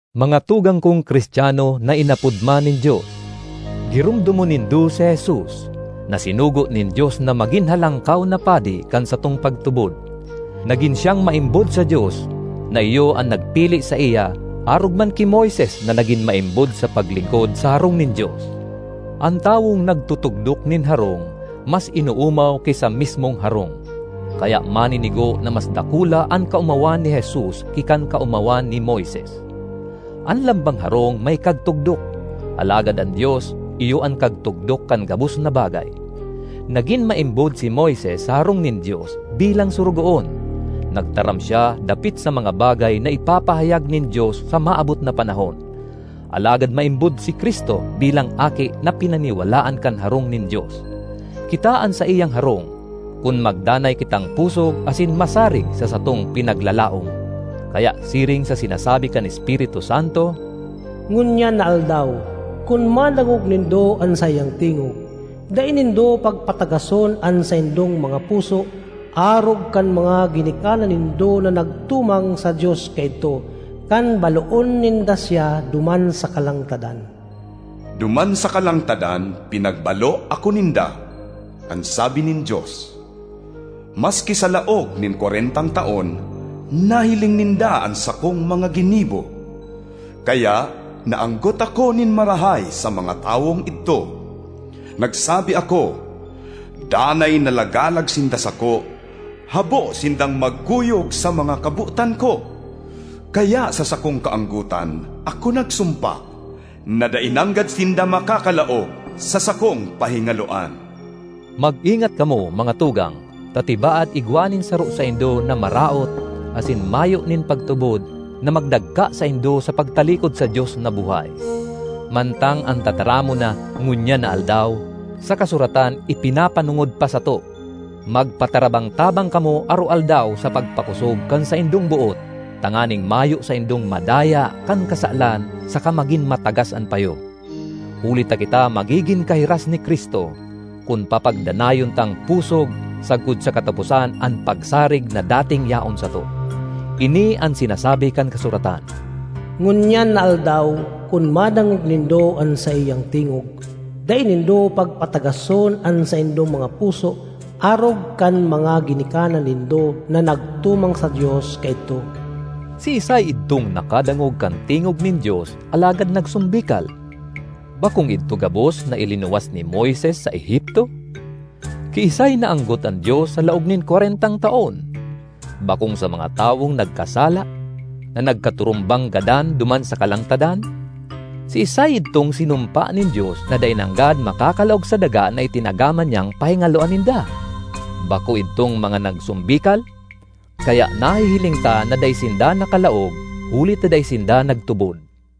Mga tugang kong Cristiano na inapod man nin Dios, giromdomon nindo si Jesus, na sinugo nin Dios na magin Halangkaw na Padi kan satong pagtubod. Nagin siyang maimbod sa Dios na iyo an nagpili saiya arog man ki Moises na nagin maimbod sa paglingkod sa harong nin Dios. An tawong nagtutugdok nin harong mas inoomaw ki sa mismong harong. Kaya maninigo na mas dakula an kaomawan ni Jesus ki kan kaomawan ni Moises. (An lambang harong may kagtugdok, alagad an Dios iyo an kagtugdok kan gabos na bagay.) Nagin maimbod si Moises sa harong nin Dios bilang sorogoon; nagtaram siya dapit sa mga bagay na ipapahayag nin Dios sa maabot na panahon. Alagad maimbod si Cristo bilang Aki na pinaniwalaan kan harong nin Dios. Kita an saiyang harong, kun magdanay kitang pusog asin masarig sa satong pinaglalaom. Kaya siring sa sinasabi kan Espiritu Santo, “Ngunyan na aldaw, kun madangog nindo an saiyang tingog, dai nindo pagpatagason an saindong mga puso arog kan mga ginikanan nindo na nagtumang sa Dios kaidto, kan baloon ninda siya duman sa kalangtadan. Duman sa kalangtadan pinagbalo ako ninda, an sabi nin Dios, maski sa laog nin kwarentang taon nahiling ninda an sakong mga ginibo. Kaya naanggot ako nin marahay sa mga tawong idto. Nagsabi ako, ‘Danay na lagalag sinda sako; habo sindang magkuyog sa mga kabotan ko.’ Kaya sa sakong kaanggotan ako nagsumpa, ‘na dai nanggad sinda makakalaog sa sakong pahingaloan!’” Mag-ingat kamo, mga tugang, ta tibaad igwa nin saro saindo na maraot asin mayo nin pagtubod na magdagka saindo sa pagtalikod sa Dios na buhay. Mantang an tataramon na “ngunyan na aldaw” sa kasuratan ipinapanongod pa sato, magpatarabang-tabang kamo aroaldaw sa pagpakosog kan saindong boot, tanganing mayo saindong madaya kan kasalan saka magin matagas an payo. Huli ta kita magigin kahiras ni Cristo, kun papagdanayon tang pusog sagkod sa kataposan an pagsarig na dating yaon sato. Ini an sinasabi kan kasuratan, “Ngunyan na aldaw kun madangog nindo an saiyang tingog, dai nindo pagpatagason an saindong mga puso arog kan mga ginikanan nindo na nagtumang sa Dios kaidto.” Siisay idtong nakadangog kan tingog nin Dios alagad nagsombikal? Bakong idto gabos na ilinuwas ni Moises sa Egipto? Kiisay naanggot an Dios sa laog nin kwarentang taon? Bakong sa mga tawong nagkasala, na nagkaturumbang gadan duman sa kalangtadan? Siisay idtong sinumpa nin Dios na dai nanggad makakalaog sa daga na itinagama niyang pahingaloan ninda? Bako idtong mga nagsombikal? Kaya nahihiling ta na dai sinda nakalaog huli ta dai sinda nagtubod.